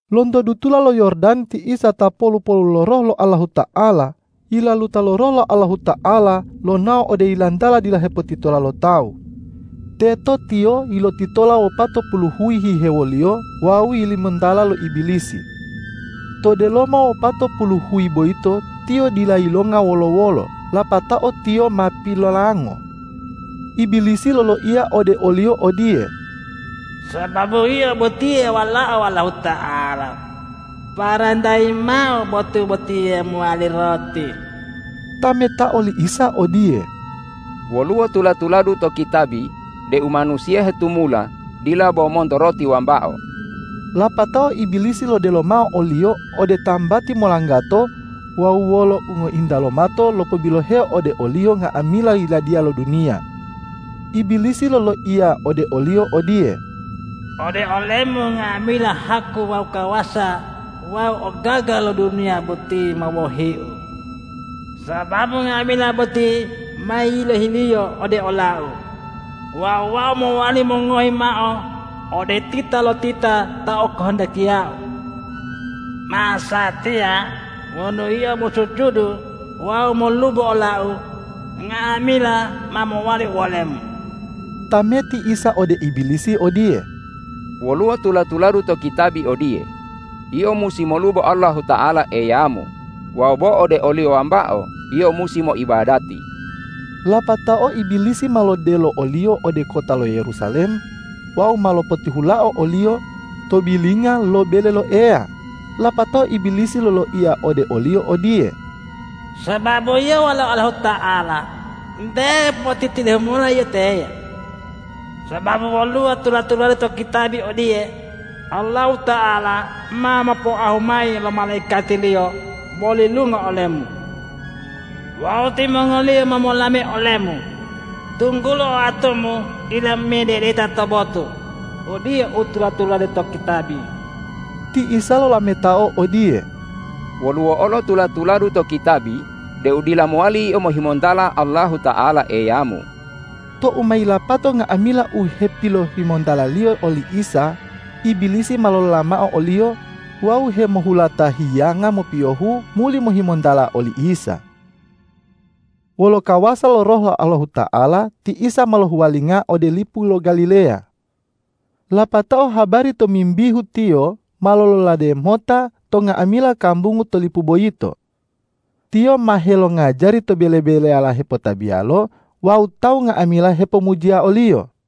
Lonto dutula lo Yordan ti Isa ta polu-polu lo Roh lo Allahuta'ala, yilaluta lo Roh Allahuta'ala lonao ode yilantala dila hepotitola lo tawu. Teto Tiyo lotitola wopatopulu huyi hihewoliyo wawu yilimontala lo Ibilisi. To delomo uwopatopulu huyi boyito Tiyo dila yilonga wolo-wolo, lapatao Tiyo ma pilolango. Ibilisi loloiya ode o-Liyo odiye,”Sababu Yio botiye Walao Allahuta'ala, parentayi mao botu botiye mowali roti.” Tametao li Isa odiye,”Woluwo tula-tuladu to kitabi deu manusiya hetumula dila bo monto roti wambao.” Lapatao Ibilisi lodelo mao o-Liyo ode tambati molanggato wawu wolo ungointa lomato lopobiloheo ode o-Liyo nga'amila yiladiya lo duniya. Ibilisi loloiya ode o-Liyo odiye,”Ode ole-Mu, nga'amila haku wawu kawasa wawu ogaga lo duniya boti ma wohiu, sababu nga'amila boti ma yilohiliyo ode olau wawu wau mowali mongohi mao ode titalotita ta okahandakiyau. Masatiya, wonu Yio mosujudu wawu molubo olau, nga'amila ma mowali uwole-Mu.” Tameti Isa ode Ibilisi odiye,”Woluwo tula-tuladu to kitabi odiye, ’Yio musi molubo Allahuta'ala Eyamu wawu bo ode o-Liyo wambao yio musi moibadati.’” Lapatao Ibilisi ma lodelo o-Liyo ode kota lo Yerusalem wawu ma lopotihulao o-Liyo to bilinga lo bele lo Eya, lapatao Ibilisi loloiya ode o-Liyo odiye,”Sababu Yio Walao Allahuta'ala, nte potitidehu mola Yio teye. Sababu woluwo tula-tuladu to kitabi odiye, ’Allahuta'ala ma mopoahu mayi lo malaikati-Liyo molilunga olemu.’ Wawu ’Timongoliyo ma molame olemu, tunggulo oatumu dila mededeta to botu.’ Odiye u tula-tulade to kitabi.” Ti Isa lolametao odiye,”Woluwo olo tula-tuladu to kitabi deu dila mowali yio mohimontala Allahuta'ala Eyamu.” Tou ma yilapato nga'amila u hepilohimontaliyo oli Isa, Ibilisi ma lolola mao o-Liyo wawu hemohulata hiyanga mopiyohu muli mohimontala oli Isa. Wolo kawasa lo Roh lo Allahuta'ala, ti Isa ma lohuwalinga ode lipu lo Galileya. Lapatao habari tomimbihu Tiyo ma lololade mota to nga'amila kambungu to lipu boyito. Tiyo ma helongajari to bele-beleyala hepotabiyalo wawu tawu nga'amila hepomujiya o-Liyo.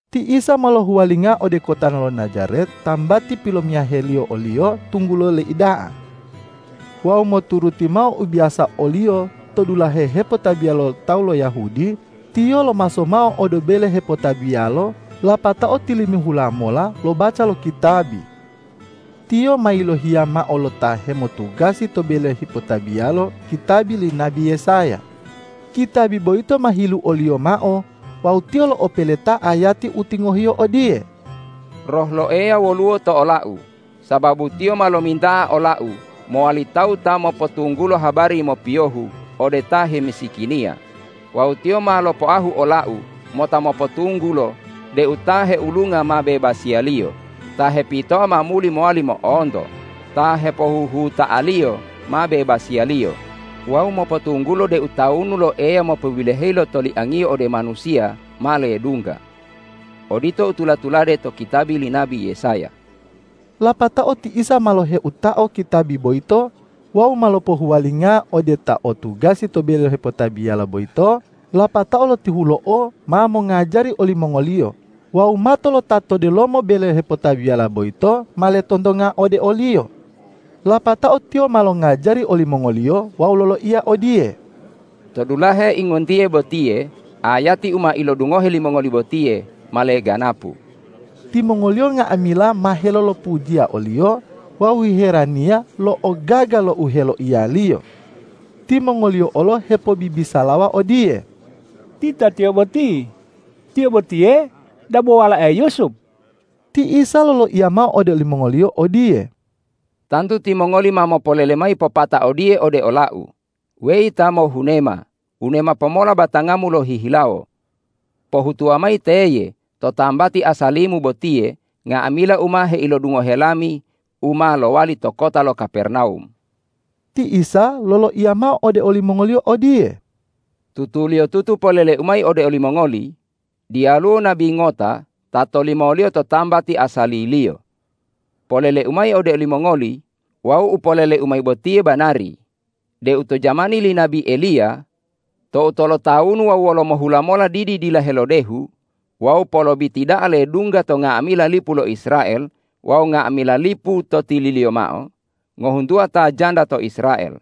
Ti Isa ma lohuwalinga ode kota lo Najaret tambati pilomiyaheliyo o-Liyo tunggulo leida'a. Wawu moturuti mao u biyasa o-Liyo to dulahe hepotabiya lo tawu lo Yahudi, Tiyo lomaso mao ode bele hepotabiyalo lapatao tilimihula mola lobaca lo kitabi. Tiyo ma yilohiya mao lo ta hemotugasi to bele hepotabiyalo kitabi li nabi Yesaya. Kitabi boyito ma hiluoliyo mao wawu Tiyo lo'opeleta ayati u tingohiyo odiye, ”Roh lo Eya woluwo to ola-U, sababu Tiyo ma lominta'a ola-U mowali tawuta mopotunggulo habari mopiyohu ode ta hemisikiniya; wawu Tiyo ma lopoahu ola-U mota mopotunggulo deu ta heulunga ma bebasiyaliyo, ta hepitoa ma muli mowali mo'onto, ta hepohuhuta'aliyo ma bebasiyaliyo wawu mopotunggulo deu tawunu lo Eya mopobiloheyi lo toliang-Iyo ode manusiya ma ledungga.” Odito u tula-tulade to kitabi li nabi Yesaya. Lapatao ti Isa ma loheutao kitabi boyito wawu ma lopohuwalingao ode ta o tugasi to bele hepotabiyalo boyito lapatao lotihulo'o ma mongajari olimongoliyo wawu mato lo ta to delomo bele hepotabiyala boyito ma letontonga ode o-Liyo. Lapatao Tiyo ma longajari olimongoliyo wawu loloiya odiye,”To dulahe ingontiye botiye ayati u ma ilodungohe limongoli botiye ma leganapu.” Timongoliyo nga'amila ma helolopujiya o-Liyo wawu hiheraniya lo ogaga lo u heloiya-Liyo. Timongoliyo olo hepobibisalawa odiye,”Tita Tiyo boti, Tiyo botiye dabo walae Yusup?” Ti Isa loloiya mao ode olimongoliyo odiye,”Tantu timongoli ma mopolele mayi popata odiye ode ola-U, ’Weyi ta mohunema, wunema pomola batangamu lohihilawo. Pohutuwa mayi teye, to tambati asali-Mu botiye, nga'amila u ma heilodungohe lami u ma lowali to kota lo Kapernawum.’” Ti Isa loloiya mao ode olimongoliyo odiye,”Tutuliyotutu polele-U mayi ode olimongoli:Diyaluwo nabi ngota ta tolimoliyo to tambati asaliliyo. Polele-U mayi ode olimongoli wawu u polele-U mayi botiye banari deu to jamani li nabi Eliya tou tolotawunu wawu wolomohula mola didi dila helodehu wawu polobiti da'a ledungga to nga'amila lipu lo Israel wawu nga'amila lipu to tililiyo mao, ngohuntuwa ta janda to Israel.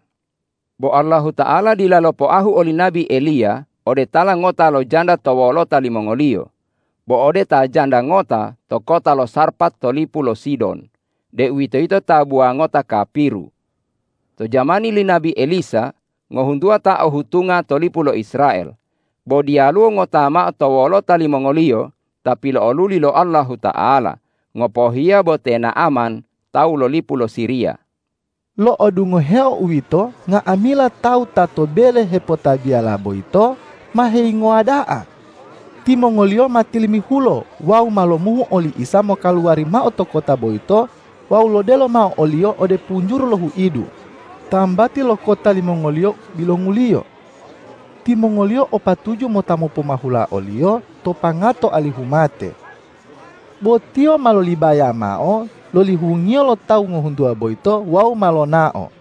Bo Allahuta'ala dila lopoahu oli nabi Eliya ode tala ngota lo janda to wolota limongoliyo, bo ode ta janda ngota to kota lo Sarpat to lipu lo Sidon, deuwitoyito tabuwa ngota kapiru. To jamani li nabi Elisa ngohuntuwa ta o hutunga to lipu lo Israel, bo diyaluwo ngota mao to wolota limongoliyo ta pilo'oluli lo Allahuta'ala, ngopohiya bo te Na'aman tawu lo lipu lo Siriya.” Lo'odungoheo uwito, nga'amila tawu ta to bele hepotabiyala boyito ma heyingowa da'a. Timongoliyo ma tilimihulo wawu ma lomuhu oli Isa mokaluwari mao to kota boyito wawu lodelo mao o-Liyo ode punjuru lo huidu, tambati lo kota limongoliyo bilonguliyo. Timongoliyo o patuju mota mopomahula o-Liyo to pangato alihu mate. Bo Tiyo ma lolibaya mao loli hungiyo lo tawu ngohuntuwa boyito wawu ma lonao.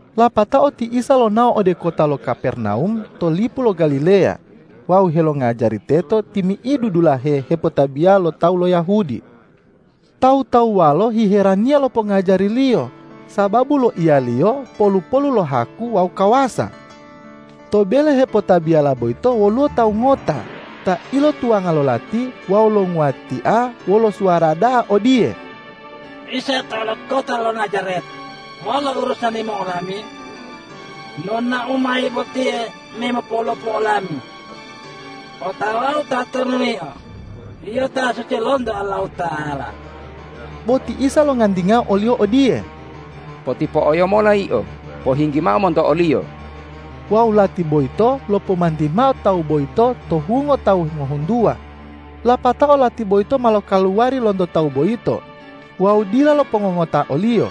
Lapatao ti Isa lonao ode kota lo Kapernawum to lipu lo Galileya wawu helongajari teto timi'idu dulahe hepotabiya lo tawu lo Yahudi. Tawu-tawuwalo hiheraniya lo pongajari-Liyo, sababu loiya-Liyo polu-polu lo haku wawu kawasa. To bele hepotabiyala boyito woluwo tawu ngota ta ilotuwanga lo lati wawu longuwatia wolo suwara da'a odiye, ”Isa tawu lo kota lo Najaret, wolo urusani-Mu wolami? Nonao-Mu mayi botiye me mopolopu olami? Otawau tatonu Yio, Yio ta suci lonto Allahuta'ala!” Bo ti Isa longantingao oliyo odiye,”Potipo'oyo mola yio, pohinggimao monto oliyo!” Wawu lati boyito lopomanti mao tawu boyito to hungo tawu ngohuntuwa, lapatao lati boyito ma lokaluwari lonto tawu boyito wawu dila lopongongota oliyo.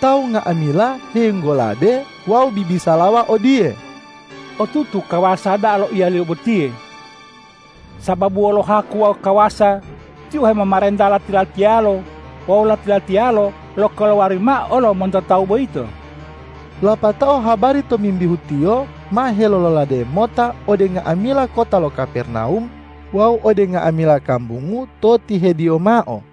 Tawu nga'amila helinggolabe wawu bibisalawa odiye,”Otutu kawasa da'a loiya-Liyo botiye! Sababu wolo haku wawu kawasa Tiyo hemomarenta lati-latiyalo wawu lati-latiyalo lokaluwari mao olo monto tawu boyito!” Lapatao habari tomimbihu Tiyo ma helololade mota ode nga'amila kota lo Kapernawum wawu ode nga'amila kambungu to tihediyo mao.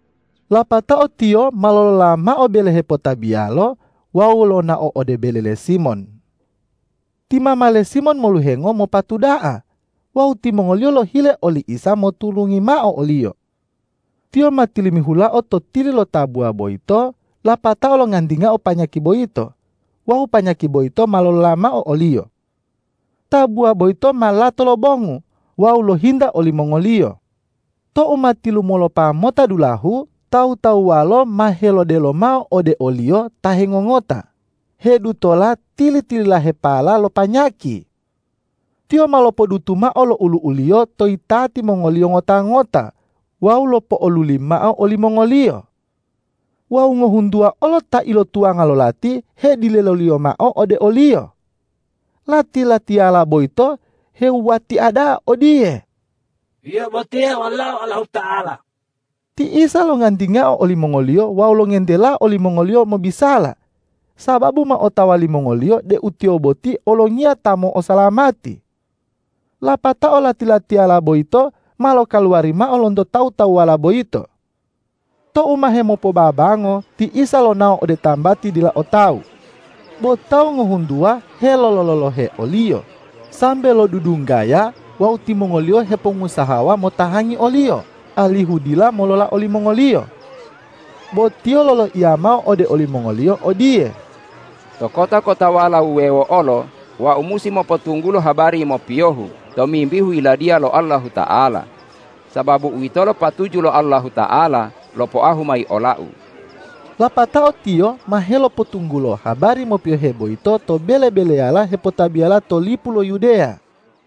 Lapatao Tiyo ma lolola mao bele hepotabiyalo wawu lonao ode bele le Simon. Ti mama le Simon moluhengo mopatu da'a wawu timongoliyo lohile oli Isa moturungi mao oliyo. Tiyo ma tilimihulao to tili lo tabuwa boyito lapatao longantingao panyaki boyito wawu panyaki boyito ma lolola mao oliyo. Tabuwa boyito ma lato lobongu wawu lohinta olimongoliyo. Tou ma tilumolopa mota dulahu, tawu-tawuwalo ma helodelo mao ode o-Liyo ta hengongota hedutola tili-tililahepala lo panyaki. Tiyo ma lopodutu mao lo ulu'u-Liyo to yitati mongoliyo ngota-ngota wawu lopo'oluli mao olimongoliyo. Wawu ngohuntuwa olo ta ilotuwanga lo lati hedileloliyo mao ode o-Liyo. Lati-latiyala boyito hewuwatia da'a odiye,”Yio botiye Walao Allahuta'ala!” Ti Isa longantingao olimongoliyo wawu longentelao olimongoliyo mobisala, sababu ma otawa limongoliyo deu Tiyo boti Olongiya ta mo'osalamati. Lapatao lati-latiyala boyito ma lokaluwari mao lonto tawu-tawuwala boyito. Tou ma hemopobabango ti Isa lonao ode tambati dila o tawu. Bo tawu ngohuntuwa helolo-lolohe o-Liyo sambe lodudunggaya wawu timongoliyo hepongusahawa motahangi o-Liyo alihu dila molola olimongoliyo. Bo Tiyo loloiya mao ode olimongoliyo odiye,”To kota-kotawala wuwewo olo Wau musi mopotunggulo habari mopiyohu tomimbihu Yiladiya lo Allahuta'ala, sababu uwitolo patuju lo Allahuta'ala lopoahu mayi ola-U.” Lapatao Tiyo ma helopotunggulo habari mopiyohe boyito to bele-beleyala hepotabiyala to lipu lo Yudeya.